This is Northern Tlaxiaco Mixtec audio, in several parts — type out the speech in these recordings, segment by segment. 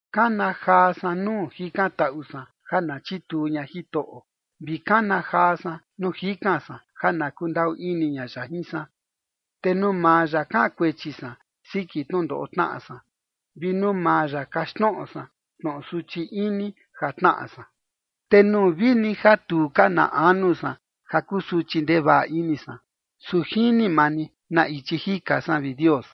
Kana jaa san nuu jikantaꞌu san ja na chituu ña Jitoꞌo, vi kana jaa san nuu jikan san ja na kundaꞌu ini ña ya jin san. Te nuu maa ya kaꞌan kuechi san siki tnundoꞌo tnaꞌa san, vi nuu maa ya kaxtnoꞌo san tnoꞌo suchi ini ja tnaꞌa san. Te nuu vini ja tu ka na anu san ja kusuchi ndevaꞌa ini san, su jini maa ni na ichi jika san, vi Dios.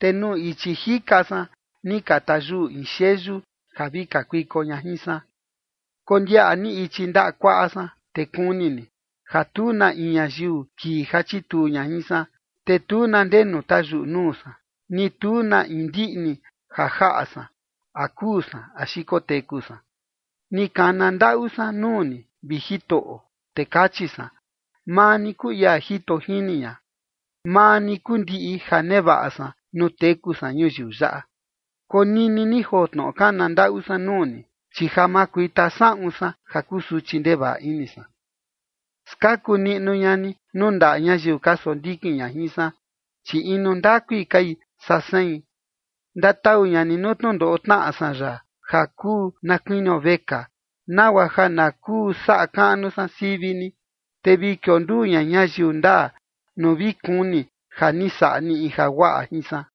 Te nuu ichi jika san ni ka tayuꞌu in xeyu ja vi kakuiko ña jin san. Kondiaꞌa ni ichi ndaꞌa kuaꞌa san, te kuni ni, ja tu na in ñayiu kii ja chituu ña jin san, te tu na ndenu tayuꞌu nuu san, ni tu na in ndiꞌni ja jaꞌa san a kuu san axi koteku san. Ni kana ndaꞌu san nuu ni, vi Jitoꞌo, te kachi san: “Maa ni kuu ia jito jini ña. Maa ni kuu ndiꞌi ja nevaꞌa san nuu teku san ñuyiu yaꞌa.” Konini ni joo tnoꞌo kana ndaꞌu san nuu ni, chi ja makuita saꞌun san ja kusuchi ndevaꞌa ini san. Skaku niꞌnu ña ni nuu ndaꞌa ñayiu ka sondikin ña jin san, chi inu ndakui kai saa sein. Ndatau ña ni nuu tnundoꞌo tnaꞌa san yaꞌa ja kuu na kuinio vekaa, nagua ja na kuu saꞌa kaꞌnu san sivi ni. Te vi kionduu ña ñayiu ndaa, nuu vi kuni ja ni saꞌa ni in jaguaꞌa jin san.